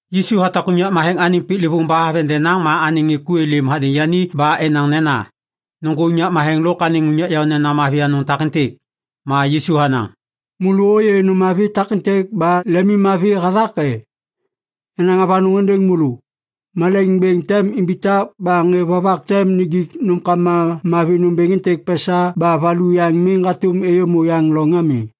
Yisu hatak unyak matheŋ anêŋ piklêvôŋ ba haveŋ denaŋ ma anêŋ ŋê ku êlêm hadêŋ yani ba enaŋ nena, “Nôŋgô unyak matheŋ lôk anêŋ unyak yaônena mavi anôŋ takêntêk!” Ma Yisu hanaŋ, “Môlô ôyê nôm takêntêk ba lemimmavi hathak e? Yanaŋ avanôŋ êndêŋ môlô. Malaiŋ bêŋ tem imbitak ba ŋê vovak tem nijik nômkama mavi nômbêŋ êntêk pesa ba valu yaŋ miŋ hatôm êyômô yaŋ loŋ ami.”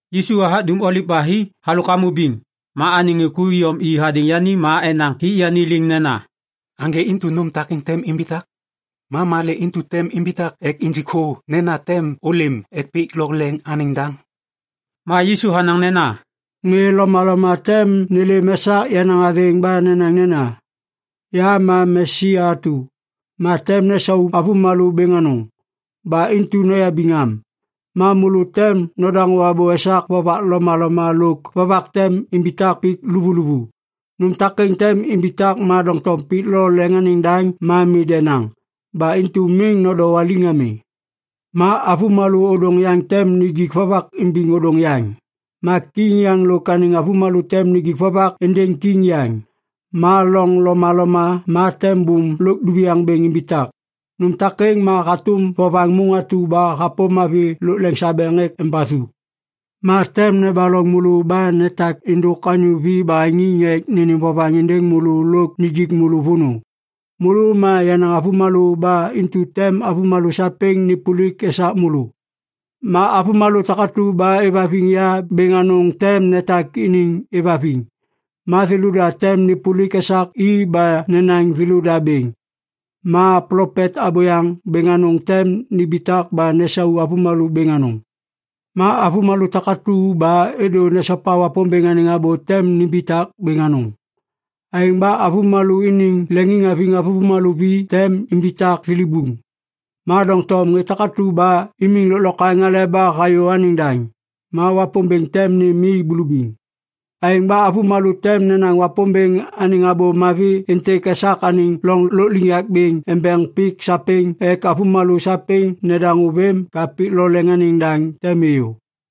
Yisu hathak Dum Oliv ba hi halôk hamô biŋ. Ma anêŋ ŋê ku iyom i hadêŋ yani ma enaŋ hik yani liŋ nena, “Aŋgê intu nôm takêŋ tem imbitak? Ma malê intu tem imbitak ek injik thô nena tem ôlêm ek pik lo leŋ anêŋ daŋ?” Ma Yisu hanaŋ nena, “Ŋê lomaloma tem nêlêm esak yenaŋ athêŋ ba nenaŋ nena, ‘Ya ma Mesia atu.’ Ma tem nesau avômalô bêŋ anôŋ. Ba intu noyabiŋ am. Ma môlô tem nodaŋô abô esak vovak lomaloma lôk vovak tem imbitak pik luvuluvu. Nôm takêŋ tem imbitak ma doŋtom pik lo leŋ anêŋ daŋ ma mi denaŋ. Ba intu miŋ nodowaliŋ ami. Ma avômalô ôdôŋ yaŋ tem nijik vovak imbiŋ ôdôŋ yaŋ. Ma kiŋ yaŋ lôk anêŋ avômalô tem nijik vovak êndêŋ kiŋ yaŋ. Ma loŋ lomaloma ma tem bôm lôk duviaŋ bêŋ imbitak. Nôm takêŋ ma hatôm vovaŋ môŋ atu ba hapôm avi lôk lasabeŋ ek embathu. “Ma tem nebaloŋ môlô ba netak êndôk anyô vi baheŋiŋ ek nênêm vovaŋ êndêŋ môlô lôk nijik môlô vônô. Môlô ma yenaŋ avômalô ba intu tem avômalô sapêŋ nêpôlik esak môlô. Ma avômalô takatu ba êvhaviŋ ya bêŋ anôŋ tem netak iniŋ êvhaviŋ, ma thêlôda tem nêpôlik esak i ba nenaŋ thêlôda bêŋ. Ma plopet abôyaŋ bêŋ anôŋ tem nimbitak ba nesau avômalô bêŋ anôŋ. Ma avômalô takatu ba êdô nesopa Wapômbêŋ anêŋ abô tem nimbitak bêŋ anôŋ. Aêŋ ba avômalô iniŋ leŋiŋhaviŋ avômalô vi tem imbitak thilibuŋ. Ma doŋtom ŋê takatu ba imiŋ lôklokwaŋ aleba hayô anêŋ daŋ, ma Wapômbêŋ tem nêm i bulubiŋ. Aêŋ ba avômalô tem nenaŋ Wapômbêŋ anêŋ Abô Mavi êntêk esak anêŋ loŋ lôkliŋyak bêŋ embeŋ pik sapêŋ ek avômalô sapêŋ nedaŋô vêm ka pik lo leŋ anêŋ daŋ tem êyô.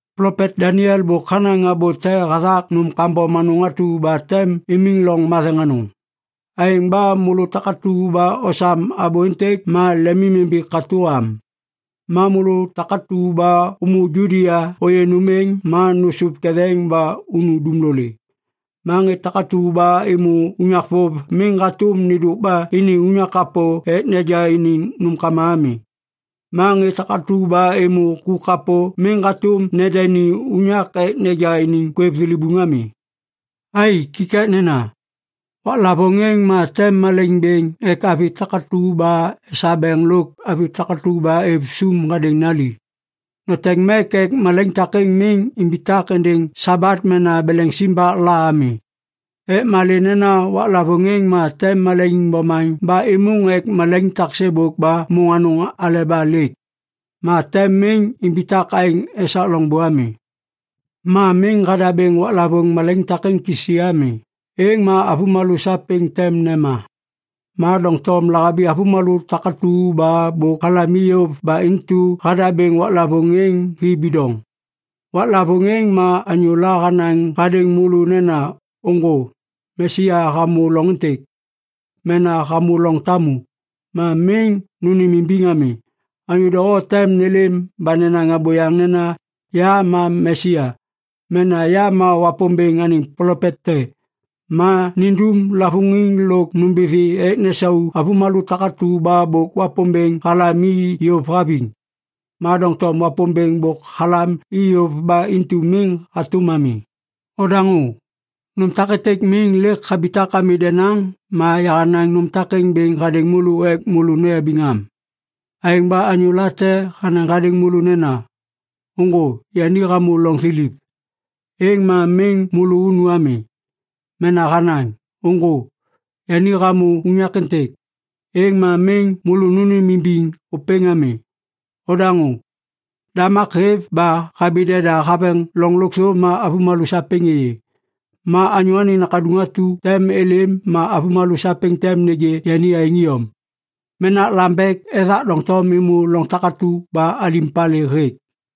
“Plopet Daniel bôk hanaŋ abô te hathak nôm kambom anôŋ atu ba tem imiŋ loŋ matheŋ anôŋ. (Aêŋ ba môlô takatu ba osam abô êntêk, ma lemimimbi katô am.) Ma môlô takatu ba ômô Judia ôyê nôm êŋ, ma nôsôv ketheŋ ba unu dumlolê. Ma ŋê takatu ba êmô unyak vôv, miŋ hatôm nêndôk ba ini unyak kapô ek neja iniŋ nômkama ami. Ma ŋê takatu ba êmô ku kapô miŋ hatôm nendeni unyak ek neja iniŋ kwêv thilibuŋ ami. Ai, kikaknena. Waklavôŋ êŋ ma tem malaiŋ bêŋ ek avi takatu ba esabeŋ lôk avi takatu ba êv sôm hadêŋ nali. Noteŋ mek ek malaiŋ takêŋ miŋ imbitak êndêŋ Sabat mena beleŋ simbak la ami. Ek malê nena waklavôŋ êŋ ma tem malaiŋ bomaŋ ba êmôŋ ek malaiŋ tak sêbôk ba môŋ anôŋ aleba lêk. Ma tem miŋ imbitak aêŋ esak loŋbô ami. Ma miŋ hadabêŋ waklavôŋ malaiŋ takêŋ kisi ami, êŋ ma avômalô sapêŋ tem nema. Ma doŋtom lahabi avômalô takatu ba bôk halam i yôv ba intu hadabêŋ waklavôŋ êŋ hi bidoŋ. “Waklavôŋ êŋ ma anyôla hanaŋ hadêŋ môlô nena, ‘Ôŋgô, Mesia hamô loŋ êntêk’ mena ‘hamô loŋ tamu,’ ma miŋ nônêmimbiŋ ami. Anyô doho tem nêlêm ba nenaŋ abôyaŋ nena, ‘Ya ma Mesia’ mena ‘Ya ma Wapômbêŋ anêŋ plopet te’, ma nindum lavôŋiŋ lôk nômbithi ek nesau avômalô takatu ba bôk Wapômbêŋ halam i yôv haviŋ. Ma doŋtom Wapômbêŋ bôk halam i yôv ba intu miŋ hatôm ami. Odaŋô! Nôm takêntêk miŋ lêk habitak ami denaŋ ma yahanaŋ nôm takêŋ bêŋ hadêŋ môlô ek môlô noyabiŋ am. “Aêŋ ba anyô late hanaŋ hadêŋ môlô nena, ‘Ôŋgô, yani hamô loŋ thiliv,’ êŋ ma miŋ môlô unu ami. Mena hanaŋ, ‘Ôŋgô, yani hamô unyak êntêk,’ êŋ ma miŋ môlô nônêmimbiŋ ôpêŋ ami. Nodaŋô! Damak hêv ba habi deda haveŋ loŋ lôkthô ma avômalô sapêŋ êyê. Ma Anyô Anêŋ Nakaduŋ atu tem êlêm ma avômalô sapêŋ tem nêgê yani aêŋ iyom. “Menak lambek ethak doŋtom êmô loŋ takatu ba alim palê hêk.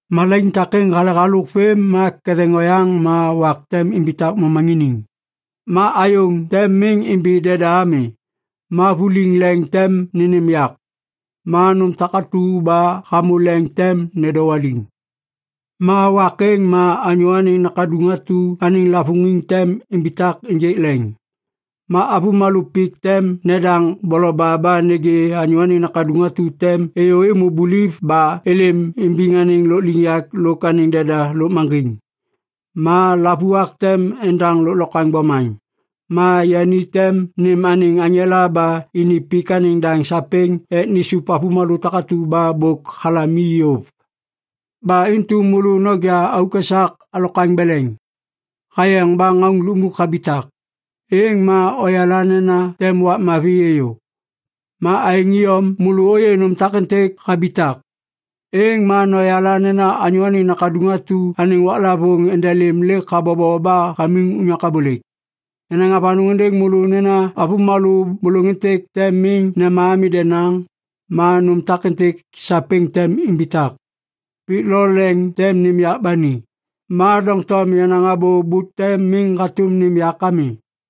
“Malaiŋ takêŋ hale halôk vêm ma ketheŋ oyaŋ ma “‘wak tem imbitak momaŋiniŋ, ma ayôŋ tem miŋ imbi deda ami, ma vuliŋ leŋ tem nênêm yak, ma nôm takatu ba hamô leŋ tem nedowaliŋ.’ “Ma wak êŋ ma Anyô Anêŋ Nakaduŋ atu anêŋ lavôŋiŋ tem imbitak ênjêk leŋ. Ma avômalô pik tem nedaŋ boloba ba nêgê Anyô Anêŋ Nakaduŋ atu tem êyô êmô buliv ba êlêm imbiŋ anêŋ lôkliŋyak lôk anêŋ deda lôkmaŋgiŋ. Ma lavuak tem endaŋ lôklokwaŋ bomaŋ, ma yani tem nêm anêŋ aŋela ba ini pik anêŋ daŋ sapêŋ ek nisup avômalô takatu ba bôk halam i yôv. “Ba intu môlô noja auk esak alokwaŋ beleŋ. Hayeŋ ba ŋauŋ lukmuk habitak, êŋ ma oyala nena tem wak mavi êyô. Ma aêŋ iyom, môlô ôyê nôm takêntêk habitak, êŋ ma noyala nena Anyô Anêŋ Nakaduŋ atu anêŋ waklavôŋ endelêm lêk habobo ba hamiŋ unyak abôlêk. Yanaŋ avanôŋ êndêŋ môlô nena avômalô bôlôŋ êntêk tem miŋ nema ami denaŋ, ma nôm takêntêk sapêŋ tem imbitak. Pik lôk leŋ tem nêm yak ba ni, ma doŋtom yenaŋ abô bute miŋ hatôm nêm yak ami.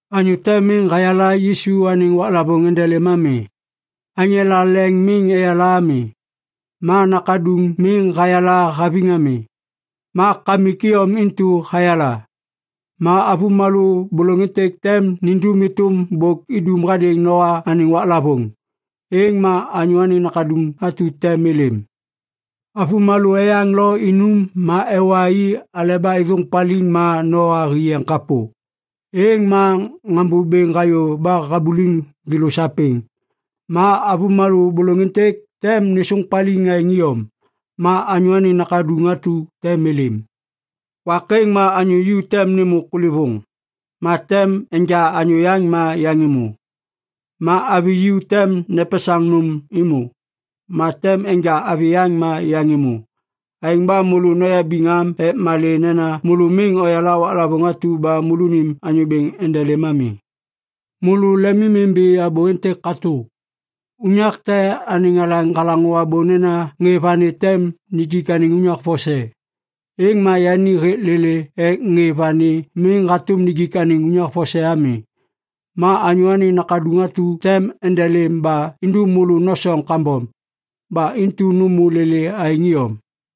“Anyô te miŋ hayala Yisu anêŋ waklavôŋ endelêm ami. Aŋela leŋ miŋ eyala ami, ma Nakaduŋ miŋ hayala haviŋ ami. Ma Kamik iyom intu hayala. Ma avômalô bôlôŋ êntêk tem nindum êtôm bôk idum hadêŋ Noa anêŋ waklavôŋ. Êŋ ma Anyô Anêŋ Nakaduŋ atu tem êlêm. Avômalô eyaŋ lo inum ma ewa i aleba êthôŋ paliŋ ma Noa hi yeŋ kapô. Êŋ ma ŋambô bêŋ hayô ba habuliŋ thêlô sapêŋ. Ma avômalô bôlôŋ êntêk tem nêsôŋ paliŋ aêŋ iyom. Ma Anyô Anêŋ Nakaduŋ atu tem êlêm. Wak êŋ, ma anyô ju tem nêmô kulêvôŋ, ma tem enja anyô yaŋ ma yaŋ êmô. Ma avi ju tem nepesaŋ nôm êmô, ma tem enja avi yaŋ ma yaŋ êmô. “Aêŋ ba môlô noyabiŋ am ek malê nena môlô miŋ oyala waklavôŋ atu ba môlônim Anyô Bêŋ endelêm ami. Môlô lemimimbi abô êntêk katô. Unyak te anêŋ alaŋ halaŋô abô nena ŋê vani tem nijik anêŋ unyak vose, êŋ ma yani hêk lêlê ek ŋê vani miŋ hatôm nijik unyak êŋ vose ami. Ma Anyô Anêŋ Nakaduŋ atu tem endelêm ba indum môlô nosoŋ kambom. Ba intu nômô lêlê aêŋ iyom.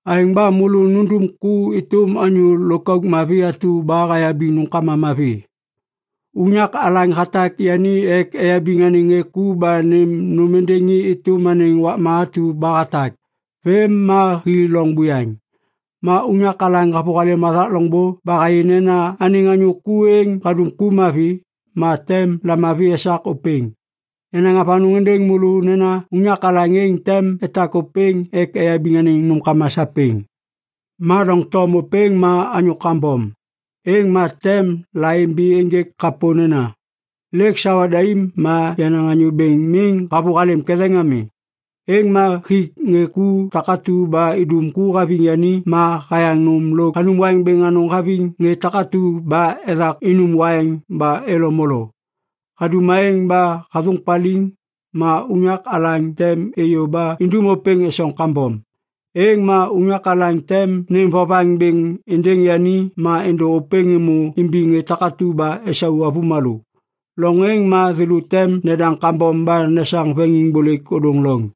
“Aêŋ ba môlô nundum ku êtôm anyô lôkauk mavi atu ba hayabiŋ nômkama mavi. Unyak alaŋ hatak yani ek eyabiŋ anêŋ ŋê ku ba nêm nôm êndêŋ i êtôm anêŋ wakma atu ba hatak. Vêm ma hi loŋ buyaŋ. Ma unyak alaŋ havôhalêm hathak loŋbô ba hayê nena anêŋ anyô ku êŋ hadum ku mavi, ma tem lamavi esak ôpêŋ. Yanaŋ avanôŋ êndêŋ môlô nena unyak alaŋ êŋ tem etak ôpêŋ ek eyabiŋ anêŋ nômkama sapêŋ. “Ma doŋtom ôpêŋ ma anyô kambom, êŋ ma tem laimbi ênjêk kapô nena, ‘Lêk sawa daim ma yenaŋ anyô bêŋ miŋ havôhalêm ketheŋ ami.’ Êŋ ma hik ŋê ku takatu ba idum ku haviŋ yani ma hayaŋ nôm lôk hanum waiŋ bêŋ anôŋ haviŋ ŋê takatu ba ethak inum waiŋ ba elo molo. Hadum aêŋ ba hathôŋ paliŋ, ma unyak alaŋ tem êyô ba indum ôpêŋ esoŋ kambom. Êŋ ma unyak alaŋ tem nêm vovaŋ bêŋ êndêŋ yani ma êndô ôpêŋ êmô imbiŋ ŋê takatu ba esau avômalô. Loŋ êŋ ma thêlô tem nedaŋ kambom ba nesaŋ veŋiŋbôlêk ôdôŋ loŋ.